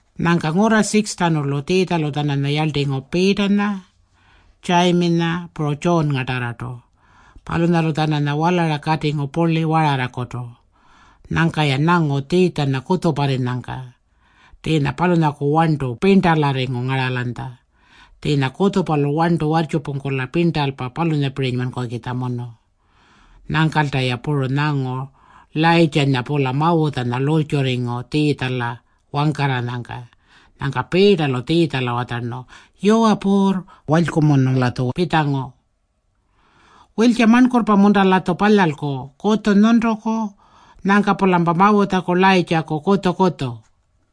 Nyangka ngurra 6-tjanulu Tjiitjalu-tjananya yarltingu Piitanya, Tjayiminya, puru Tjuunngatarrartu. Palunyalu-tjananya walara katingu purli wararrakutu. Nyangka-ya nyangu Tjiitjanya kutjuparrinyangka. Tjiinya palunyaku warntu pirntalarringu ngaralanytja. Tjiinya kutjupalu warntu warrtjupungkula pirntalpa palunyapirinymankukitjamunu. Nyangkalta-ya puru nyangu Layirrtjanya-pula Mawutjanya lurrtjurringu Tjiitjala wangkarranyangka. Nyangka Piitalu Tjiitjala watjarnu, “Yuwa Puurr, walykumunu-latju pitjangu. Wiltja marnkurrpa-munta-latju palyalku, kutju nyuntuku, nyangka-pulampa Mawutjaku Layirrtjaku kutju-kutju?”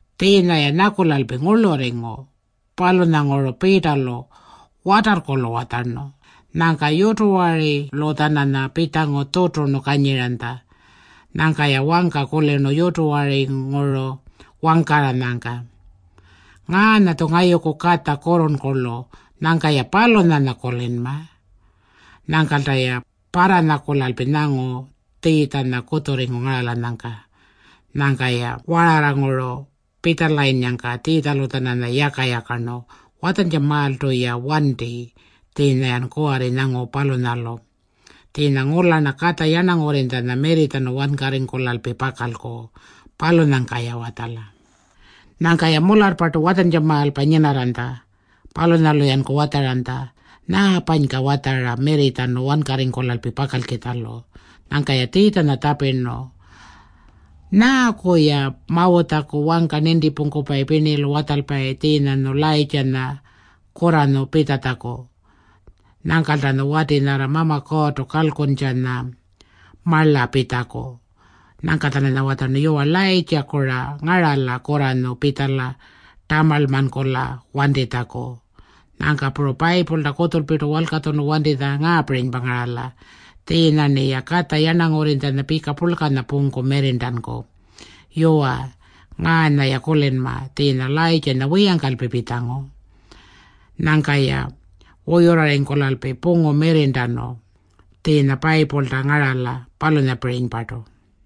Tjiinya-ya nyakulalpi ngurlurringu. Palunyanguru Piitalu watarrkulu watjarnu. Nyangka yutuwarilu-tjananya pitjangu tjuturnu kanyiranytja. Nyangka-ya wangka kulirnu yutuwaringuru wangkarranyangka, “Ngaanya-tju ngayuku Katja kurrurnkurlu. Nyangka-ya palunyanya kulinma.” Nyangkalta-ya parranyakulalpi nyangu Tjiitjanya kutjurringu ngaralanyangka. Nyangka-ya wararranguru pitjalayinnyangka Tjiitjalu-tjananya yaka-yakarnu, “Watjantjamaaltu-ya wanti tjiinya-yan kuwarri nyangu palunyalu. Tjiinya ngula-rna Katja Yarnangurrinytjanya mirritjanu wankarringkulalpi pakalku. Palunyangka-ya watjala.” Nyangka-ya mularrpartu watjantjamaalpa nyinarranytja. Palunyalu-yanku watjaranytja, “Nyaapanyka watjara mirritjanu wankarringkulalpi pakalkitjalu?” Nyangka-ya Tjiitjanya tjapirnu, “Nyaaku-ya Mawutjaku wangka nintipungkupayi pirnilu watjalpayi tjiinyanyu Layirrtjanya kurranyu pitjatjaku? Nyangkaltanyu wati nyarra Mama Kuurrtu kalkuntjanya marla pitjaku?” Nyangka-tjananya watjarnu, “Yuwa, Layirrtjaku-ra ngarala kurranyu pitjala tamarlmankula wantitjaku. Nyangka puru Payipulta kutjulpirtu walkatjunu wantitjanya ngaapirinypa ngarala. Tjiinya-rniya Katja Yarnangurrinytjanya pika purlkanya pungku mirrirntanku. Yuwa, ngaanya-ya kulinma. Tjiinya Layirrtjanya wiyangkalpi pitjangu. Nyangka-ya wuyurrarringkulalpi pungu mirrirntanu tjiinya Payipulta ngarala, palunyapirinypartu.”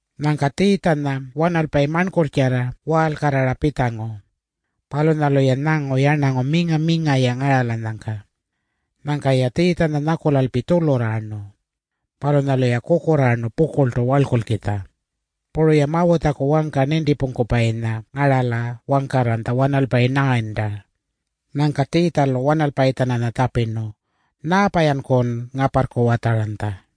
Nyangka Tjiitjanya wanalpayi marnkurrtjarra waalkarrara pitjangu. Palunyalu-ya nyangu yarnangu minga-minga-ya ngaralanyangka. Nyangka-ya Tjiitjanya nyakulalpi tjulurraarnu. Palunyalu-ya kukurraarnu pukurltu warlkulkitja. Puru-ya Mawutjaku wangka nintipungkupayinya ngarala wangkarranytja wanalpayi 9-ta. Nyangka Tjiitjalu wanalpayi-tjananya tjapirnu, “Nyaapa-yankun ngaparrku watjaranytja?”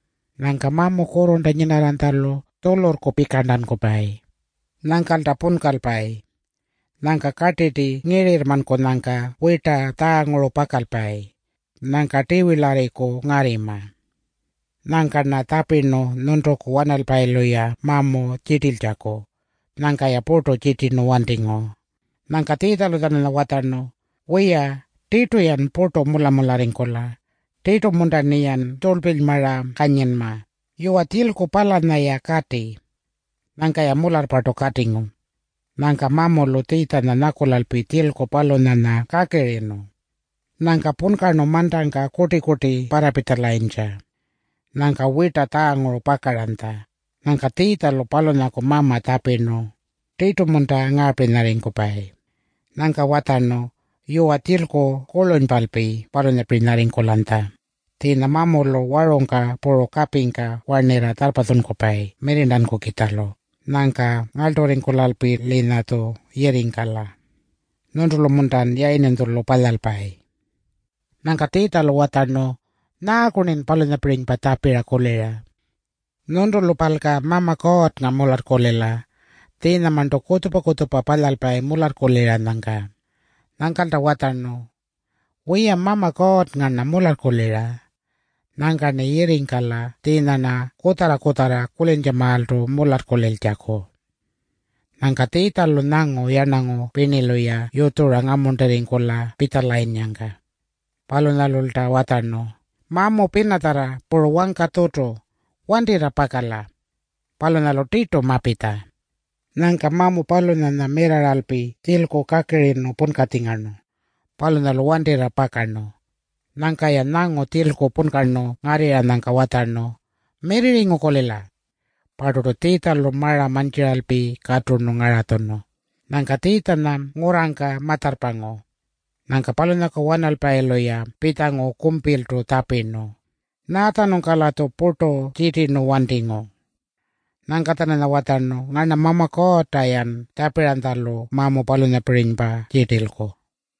Nyangka mamu kurrurnta nyinarranytjalu tjulurrku pikarntankupayi. Nyangkalta punkalpayi. Nyangka kartirti ngirirrmankunyangka wirta tjaanguru pakalpayi. Nyangka tiwilarriku ngarrima. Nyangka-rna tjapirnu nyuntuku wanalpayilu-ya mamu tjirtiltjaku. Nyangka-ya purtu tjirtirnu wantingu.” Nyangka Tjiitjalu-tjananya watjarnu, “Wiya, tirtu-yan purtu mula-mularringkula! Tirtu-munta-rniyan tjurlpilymara kanyinma? Yuwa, tjilku palanya-ya kati.” Nyangka-ya mularrpartu katingu. Nyangka mamulu Tjiitjanya nyakulalpi tjilku palunyanya kakirinu. Nyangka punkarnu mantangka kurti-kurti parrapitjalanytja. Nyangka wirta tjaanguru pakaranytja. Nyangka Tjiitjalu palunyaku mama tjapirnu, “Tirtu-munta ngaapirinyarringkupayi?” Nyangka watjarnu, “Yuwa, tjilku kurlunypalpi palunyapirinyarringkulanytja. Tjiinya mamulu warungka puru kapingka warnirra tjarrpatjunkupayi mirrirntankukitjalu. Nyangka ngarlturringkulalpi-linyatju yirringkala. Nyuntulu-muntan yayirninytjulu palyalpayi?” Nyangka Tjiitjalu watjarnu, “Nyaaku-rnin palunyapirinypa tjapira? Nyuntulupalka Mama Kuurrnga mularrkulila. Tjiinyamarntu kutjupa-kutjupa palyalpayi mularrkuliranyangka.” Nyangkalta watjarnu, “Wiya, Mama Kuurrnga-rna mularrkulira. Nyangka-rni yirringkala tjiinya-rna kutjarra-kutjarra kulintjamaaltu mularrkuliltjaku.” Nyangka Tjiitjalu nyangu yarnangu pirnilu-ya yutjura ngamuntirringkula pitjalayinnyangka. Palunyalulta watjarnu, “Mamu pinatjarra puru wangka tjutu, wantirra pakala. Palunyalu tirtu mapitja.” Nyangka mamu palunyanya mirrarralpi tjilku kakirinu punkatjingarnu. Palunyalu wantirra pakarnu. Nyangka-ya nyangu tjilku punkarnu ngarrirranyangka watjarnu, “Mirrirringu-kulila.” Parturtu Tjiitjalu mara mantjiralpi katurnu ngaratjunu. Nyangka Tjiitjanya ngurrangka ma-tjarrpangu. Nyangka palunyaku wanalpayilu-ya pitjangu kumpiltu tjapirnu, “Nyaatjanungka-latju purtu tjirtirayirnu wantingu?” Nyangka-tjananya watjarnu, “Ngarna Mama Kuurrta-yan tjapiranytjalu mamu palunyapirinypa tjirtilku.”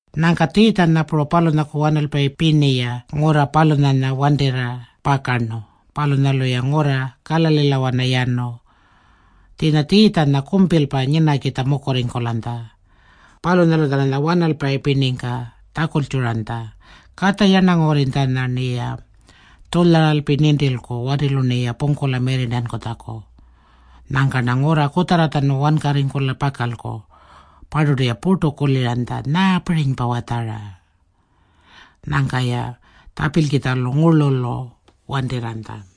Nyangka Tjiitjanya puru palunyaku wanalpayi pirni-ya ngurra palunyanya wantirra pakarnu. Palunyalu-ya ngurra Kalalilawana yanu. Tjiinya Tjiitjanya kumpilpa nyinakitja mukurringkulanytja. Palunyalu-tjananya wanalpayi pirningka tjakultjuranytja, “Katja Yarnangurrinytjanya-rniya tjulyaralpi nintilku watilu-rniya pungkula mirrirntankutjaku. Nyangka-rna ngurra kutjarratjanu wankarringkula pakalku.” Parturtu-ya purtu kuliranytja, “Nyaapirinypa watjara?” Nyangka-ya tjapilkitjalu ngurlulu wantirranytja.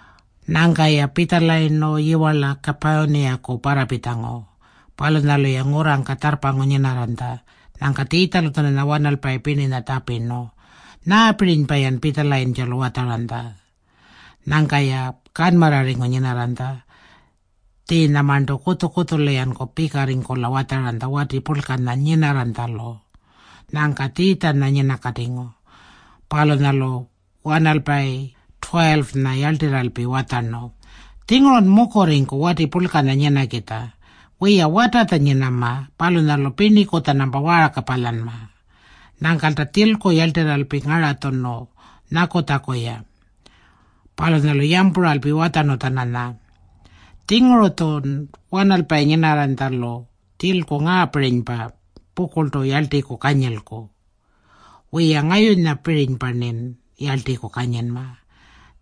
Nyangka-ya pitjalayirnu yiwarla Kapurniyaku parrapitjangu. Palunyalu-ya ngurrangka tjarrpangu nyinarranytja. Nyangka Tjiitjalu-tjananya wanalpayi pirninya tjapirnu, “Nyaapirinypa-yan pitjalayintjalu watjaranytja?” Nyangka-ya kanmarrarringu nyinarranytja. Tjiinyamarntu kutju-kutjulu-yanku pikarringkula watjaranytja wati purlkanya nyinarranytjalu. Nyangka Tjiitjanya nyinakatingu. Palunyalu wanalpayi 12-nya yarltirralpi watjarnu, “Tjingurun mukurringku wati purlkanya nyinakitja. Wiya, watatja nyinama. Palunyalu pirniku-tjanampa waarka palyanma.” Nyangkalta tjilku yarltirralpi ngaratjunu nyakutjaku-ya. Palunyalu yampuralpi watjarnu-tjananya, “Tjinguru-tjun wanalpayi nyinarranytjalu tjilku ngaapirinypa pukurltu yarltiku kanyilku. Wiya, ngayunyapirinypa-rnin yarltiku kanyinma.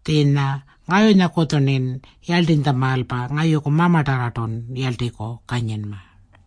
Tjiinya ngayunyakutju-rnin yarltinytjamaalpa ngayuku Mamatarrartun yarltiku kanyinma.”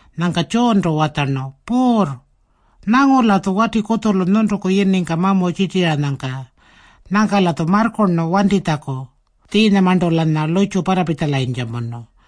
Nyangka Tjuuntu watjarnu, “Puurr, nyangu-latju wati kutjulu nyuntuku yiningka mamu tjirtiranyangka. Nyangka-latju marrkurnu wantitjaku. Tjiinyamarntu-lanya lurrtju parrapitjalanytjamunu.”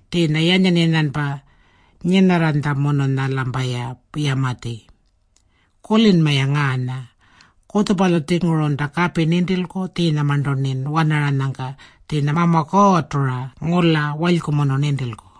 Tjiinya yanyan-yanyanpa nyinarranytjamununya-lampaya yamatji. Kulinma-ya ngaanya. Kutjupalu-tjingurunta kapi nintilku tjiinyamarntu-rnin wanaranyangka. Tjiinya Mama Kuurrtu-ra ngula walykumunu nintilku.”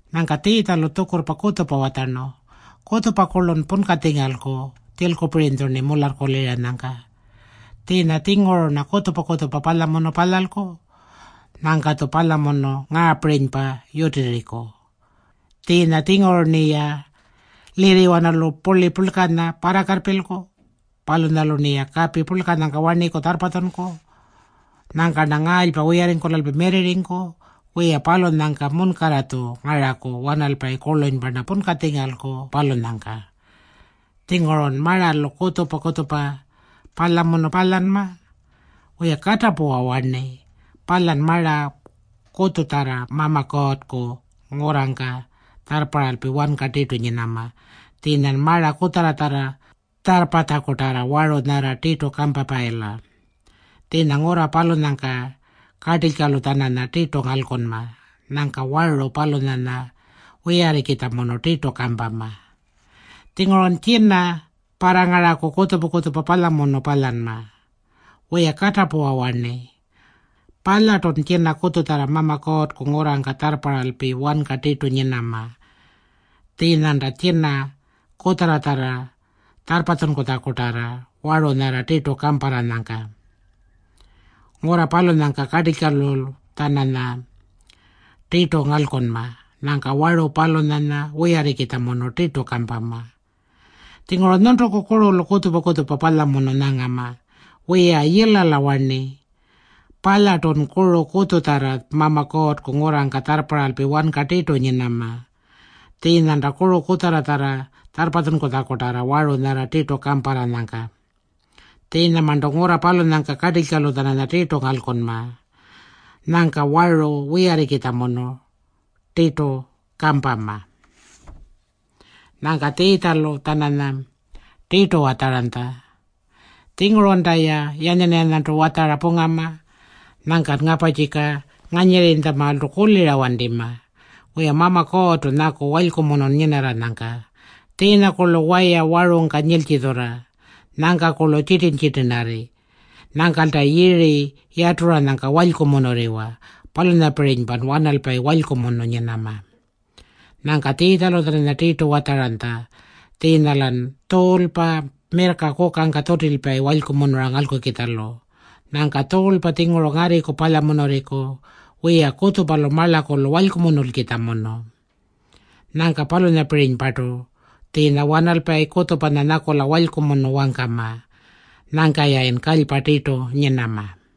Nyangka Tjiitjalu tjukurrpa kutjupa watjarnu, “Kutjupa-kurlun punkatjingalku tjilkulupirinytju-rni mularrkuliranyangka. Tjiinya-tjinguru-rna kutjupa-kutjupa palyamunu palyalku. Nyangka-tju palyamunu ngaapirinypa yutirriku. Tjiinya-tjinguru-rniya lirriwanalu purli purlkanya parrakarrpilku. Palunyalu-rniya kapi purlkanyangka warniku tjarrpatjunku. Nyangka-rna ngaalypa wiyarringkulalpi mirrirringku. Wiya, palunyangka munkarra-tju ngaraku wanalpayi kurlunypa-rna punkatjingalku, palunyangka. Tjingurun maralu kutjupa-kutjupa palyamunu palyanma. Wiya, katapuwa warni. Palyan mara kutjutjarra Mama Kuurrku ngurrangka tjarrparralpi wanka tirtu nyinama, tjiinyan mara kutjarratjarra tjarrpatjakutarra waru nyarra tirtu kampapayila. [Tjiinya ngurra palunyangka kartilykalu-tjananya tirtu ngalkunma. Nyangka waru palunyanya wiyarrikitjamunu tirtu kampama.] Tjingurun tjina parrangaraku kutjupa-kutjupa palyamunu palyanma. Wiya, katapuwa warni. Palyartun tjina kutjutjarra Mama Kuurrku ngurrangka tjarrparralpi wanka tirtu nyinama, tjiinyanta tjina kutjarratjarra tjarrpatjunkutjakutarra waru nyarra tirtu kamparranyangka. [Ngurra palunyangka kartilykalu-tjananya tirtu ngalkunma. Nyangka waru palunyanya wiyarrikitjamunu tirtu kampama.] Tjinguru nyuntuku kurulu kutjupa-kutjupa palyamunu nyangama. Wiya, yilala warni. Palyartun kuru kutjutjarra Mama Kuurrku ngurrangka tjarrparralpi wanka tirtu nyinama, tjiinyanta kuru kutjarratjarra tjarrpatjunkutjakutarra waru nyarra tirtu kamparranyangka. Tjiinyamarntu ngurra palunyangka kartilykalu-tjananya tirtu ngalkunma. Nyangka waru wiyarrikitjamunu tirtu kampama.” Nyangka Tjiitjalu-tjananya tirtu watjaranytja, “Tjingurunta-ya yanyan-yanyantu watjara pungama. Nyangkan ngaparrtjika nganyirrimaaltu kulira wantima. Wiya, Mama Kuurrtu nyaku walykumunun nyinarranyangka. Tjiinyakurlu waya warungka nyiltjitjurra. Nyangkakurlu tjitirn-tjitirnarri. Nyangkalta yiri yaturanyangka walykumunurriwa. Palunyapirinypan wanalpayi walykumunu nyinama.” Nyangka Tjiitjalu-tjananya tirtu watjaranytja, “Tjiinya-lan tjuulpa mirrka kukangka tjutilpayi walykumunura ngalkukitjalu. Nyangka tjuulpa-tjinguru ngarriku palyamunurriku. Wiya, kutjupalu marlakulu walykumunulkitjamunu. Nyangka palunyapirinypartu tjiinya wanalpayi kutjupanya nyakula walykumunu wangkama. Nyangka-yayin kalypa tirtu nyinama.”